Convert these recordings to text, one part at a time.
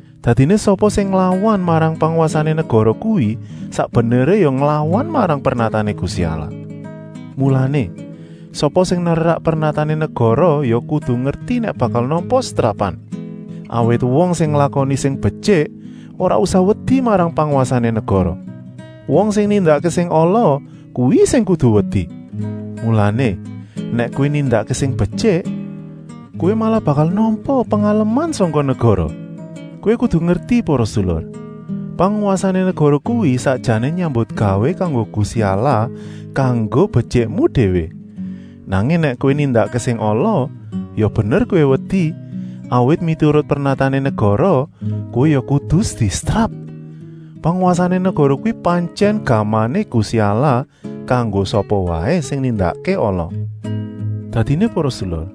Dadiné sapa sing nglawan marang pangwasané negara kuwi sak beneré ya nglawan marang pernatané Gusti Allah. Mulané, sapa sing nerak pernatané negara ya kudu ngerti nèk bakal nampa setrapan. Awit wong sing nglakoni sing betyik ora usah wedi marang pangwasané negara. Wong sing nindakké sing ala, kuwi sing kudu wedi. Mulané, nèk kowé nindakké sing betyik, kowé ora usah wedi, kowé malah bakal nampa pengaleman sangka negara. Kowé kudu ngerti para sedulur, pangwasané negara kuwi sakjané nyambutgawé kanggo Gusti Allah kanggo betyikmu déwé. Nanging nèk kowé nindakké sing ala, ya bener kowé wedi, awit miturut pernatané negara kowé ya kudu disetrap. Pangwasané negara kuwi pantyèn gamané Gusti Allah kanggo sapa waé sing nindakké ala. Dadiné para sedulur,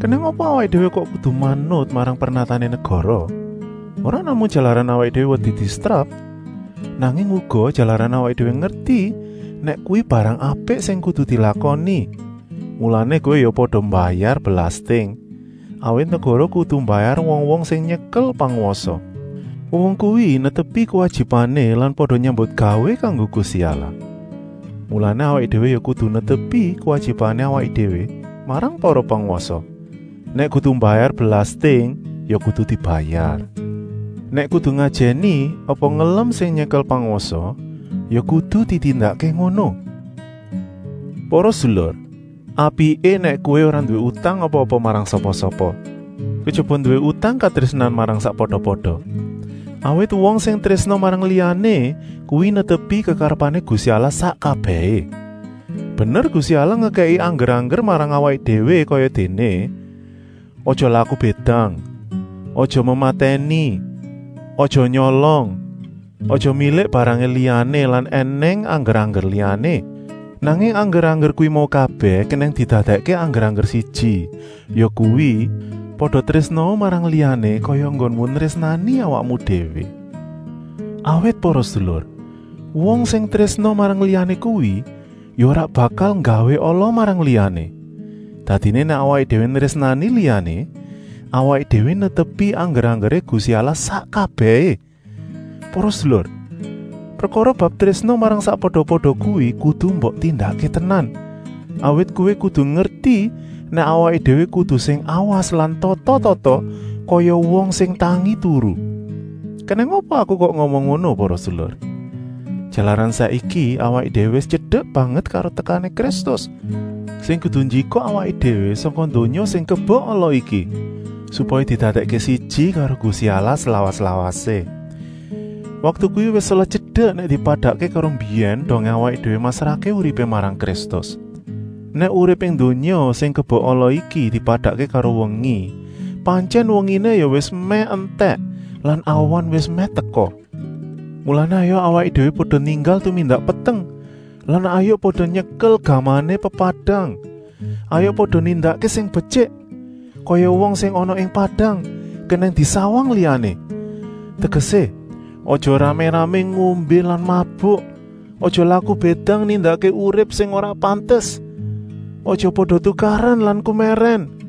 kenèng apa awaké déwé kok kudu manut marang pernatané negara? Ora namung jalaran wedi disetrap, nanging uga jalaran awaké déwé ngerti nèk kuwi barang apik sing kudu dilakoni. Mulané kowé ya pada mbayar belasting, awit negara kudu mbayar wong-wong sing nyekel pangwasa. Wong-wong kuwi netepi kuwajibané lan pada nyambutgawé kanggo Gusti Allah. Mulané awaké déwé ya kudu netepi kuwajibané awaké déwé marang para pangwasa. Nèk kudu mbayar belasting ya kudu dibayar, nèk kudu ngajèni apa ngelem sing nyekel pangwasa, ya kudu ditindakké ngono. Para sedulur, apiké nèk kowé ora nduwé utang apa-apa marang sapa-sapa, kejaba nduwé utang katrésnan marang sakpada-pada. Awit wong sing trésna marang liyané kuwi netepi kekarepané Gusti Allah sak kabèhé. Bener Gusti Allah ngekèki angger-angger marang awaké déwé kayadéné: aja laku bédang, aja mematèni, aja nyolong, aja milik barangé liyané lan ènèng angger-angger liyané. Nanging angger-angger kuwi mau kabèh kenèng didadèkké angger siji, yakuwi: pada trésnaa marang liyané kaya enggonmu nrésnani awakmu déwé. Awit para sedulur, wong sing trésna marang liyané kuwi ya ora bakal nggawé ala marang liyané. Dadiné nèk awaké déwé nrésnani liyané, awaké déwé netepi angger-anggeré Gusti Allah sak kabèhé. Para sedulur, prekara bab trésna marang sakpada-pada kuwi kudu mbok tindakké tenan, awit kowé kudu ngerti nèk awaké déwé kudu sing awas lan tata-tata, kaya wong sing tangi-turu. Kenèng apa aku kok ngomong ngono para sedulur? Jalaran saiki awaké déwé wis tyedek banget karo tekané Kristus, sing kudu njikuk awaké déwé sangka donya sing kebek ala iki, supaya didadèkké siji karo Gusti Allah slawas-lawasé. Waktu kuwi wis selot tyedek nèk dipadakké karo mbiyèn dongé awaké déwé masrahké uripé marang Kristus. Nèk urip ing donya sing kebek ala iki dipadakké karo wengi, pantyèn wenginé ya wis mèh entèk lan awan wis mèh teka. Mulané hayuk awaké déwé pada ninggal tumindak peteng lan hayuk pada nyekel gamané pepadang. Hayuk pada nindakké sing betyik, kaya wong sing ana ing padang kenèng disawang liyané. Tegesé, aja ramé-ramé ngombé lan mabuk, aja laku bédang nindakké urip sing ora pantes, aja pada tukaran lan kumèrèn.